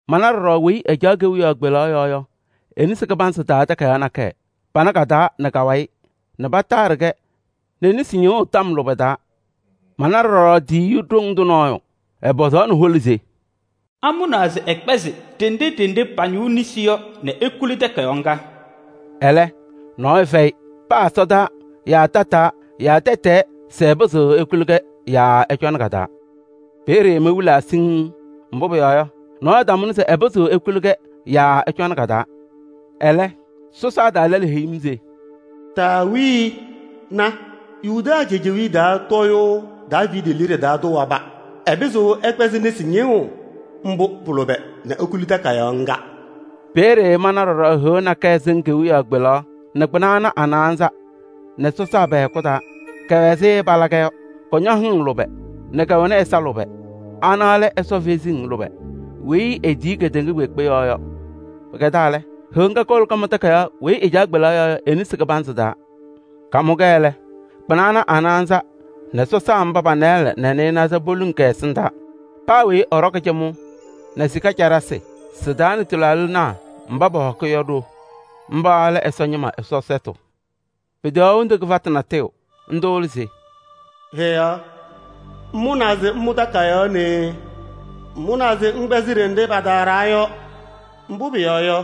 Mana ɖɔɖɔ weyi ɛcaɣ kewiyaɣ kpelaɣ yɔɔ yɔ e-nesi kɩbanzɩ taa takayaɣ nakɛyɛ, pama ka-taa nɛ ka-wayɩ nɛ pataaɖɩ-kɛ nɛ nesi ñɩɣʋ tɔm lʋbɛ taa. Mana ɖɔɖɔ Ɛsɔ tiyiyu ɖoŋ tʋ nɔɔyʋ, ɛpɔzaɣnɩ hola se: “Amʋnaa se ɛkpɛzɩ ɖenɖe ɖenɖe pañɩɣ nesi yɔ nɛ ekuli takayaɣ ŋga?” Ɛlɛ, nɔɔyʋ fɛyɩ: paa ɛsɔdaa yaa tataa yaa tɛtɛɛ se ɛpɩzɩɣ ekuli-kɛ yaa ɛcɔnɩ ka-taa. Peeye mewilaa siŋŋ. Mbʋ pʋyɔɔ yɔ, nɔɔyʋ tamʋnɩ se ɛpɩzɩɣ ekuli-kɛ yaa ɛcɔnɩ ka-taa. Ɛlɛ, sɔsaa taa lɛlʋ heyi-m se: “Taawii! Na, Yuda cejewiye taa tɔɔyʋʋ Daaviidi liɖe taa tʋ waba: ɛpɩzɩɣ ɛkpɛzɩ nesi ñɩɣʋ mbʋ pʋ-lʋbɛ nɛ ekuli takayaɣ ŋga.” Peeye mana ɖɔɖɔ Heɣa nakɛyɛ sɩŋ kewiyaɣ kpelaɣ nɛ kpɩna ana a-naanza nɛ sɔsaa pɛ-hɛkʋ taa. Kɛwɛ ɛzɩ pɛcɛbɩ ke-liu tɛɛ yɔ. Kɔñɔ hɩŋ lʋbɛ nɛ kɛwɛnɩ ɛza lʋbɛ. Ana lɛ Ɛsɔ kalɩzasɩ lʋbɛ nzɩ etiyi kedeŋa kpeekpe yɔɔ yɔ. Pɩkɛdaa lɛ, Heɣa ŋga kowolo kamʋ takayaɣ weyi ɛcaɣ kewiyaɣ kpelaɣ yɔɔ yɔ e-nesi kɩbanzɩ taa. Kamʋ-kɛ lɛ, kpɩna ana a-naanza nɛ sɔsaa mba pa-nɩɩlɛ nɛ naanza poluŋ kɛ-ɛsɩndaa. Paa weyi ɛɖɔkɩ cɩmʋʋ nɛ sika caɖasɩ, sɩ-taa nɛ tɩlaaɖɩnaa mba pɔhɔkɩ yɔ ɖo. Mba lɛ Ɛsɔ ñɩma Ɛsɔ sɛtʋ. Peteɣaɣ hendu kɩfatʋ natʋyʋ. Ndʋ lɛ se: “Heɣa ŋmʋnaa se ŋmʋ takayaɣ nee. Ŋmʋnaa se ŋkpɛzɩ ɖenɖe pataaɖaa yɔ. Mbʋ pʋyɔɔ yɔ,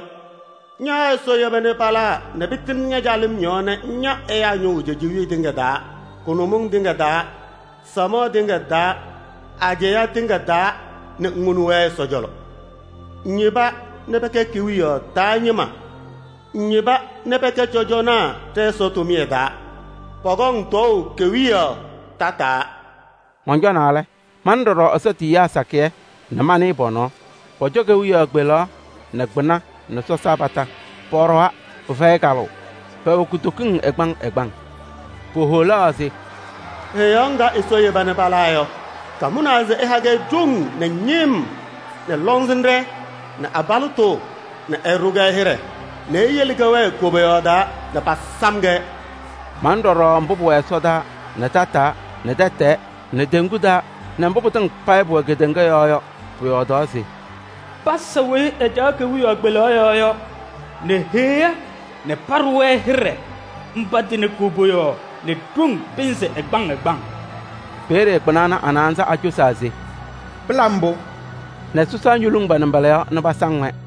ña Ɛsɔ yeba nɛ palaa nɛ pɩtɩŋnɩ ña-calɩm yɔɔ nɛ ŋya ɛyaa ñʋʋ cejewee tɩŋa taa, kʋnʋmɩŋ tɩŋa taa, samaɣ tɩŋa taa, ajɛɛ tɩŋa taa nɛ ŋwoni-wɛ Ɛsɔ cɔlɔ. Ŋyeba nɛ pɛkɛ kewiyaɣ taa ñɩma nɛ cɔjɔnaa ɖɛ-Ɛsɔ tʋmɩyɛ taa. Pɔkɔŋ tɔɔʋ kewiyaɣ tataa.” Mɔncɔnaa lɛ, mana ɖɔɖɔ Ɛsɔ tiyiyaa sakɩyɛ nɛ manɩɩ pɔ-nɔɔ. Pɔcɔ kewiyaɣ kpelaɣ nɛ kpɩna nɛ sɔsaa kondiko. Pɔɖɔwa pɩfɛyɩ kalʋʋ, pɛwɛ kutokiŋ ɛgbaŋ ɛgbaŋ. Poholaɣ se: “Heɣa ŋga Ɛsɔ yeba nɛ palaa yɔ, kamʋnaa se ɛha-kɛ ɖoŋ nɛ ñɩm nee nɛ lɔŋsɩnɖɛ nɛ abalɩtʋ nɛ ɛɖʋ-kɛ hɩɖɛ nɛ eyele kɛwɛɛ koboyaɣ taa nɛ pasam-kɛ.” Manɩ ɖɔɖɔ mbʋ pʋwɛ ɛsɔdaa nɛ tataa nɛ tɛtɛɛ nɛ teŋgu taa nɛ mbʋ pɩtɩŋa payɩ pʋwɛ kedeŋa yɔɔ yɔ, pɔyɔɔdaɣ se: “Pasa weyi ɛcaɣ kewiyaɣ kpelaɣ yɔɔ yɔ nɛ Heɣa nɛ paɖʋ-wɛ hɩɖɛ, mba tɩnɩ koboyaɣ nɛ ɖoŋ pɩnzɩ ɛgbaŋ ɛgbaŋ!” Peeye kpɩna ana a-naanza acosaa se: “Pɩla mbʋ!” Nɛ sɔsaa ñoluŋ pa-nɩmbɔla yɔɔ nɛ pasaŋ-wɛ.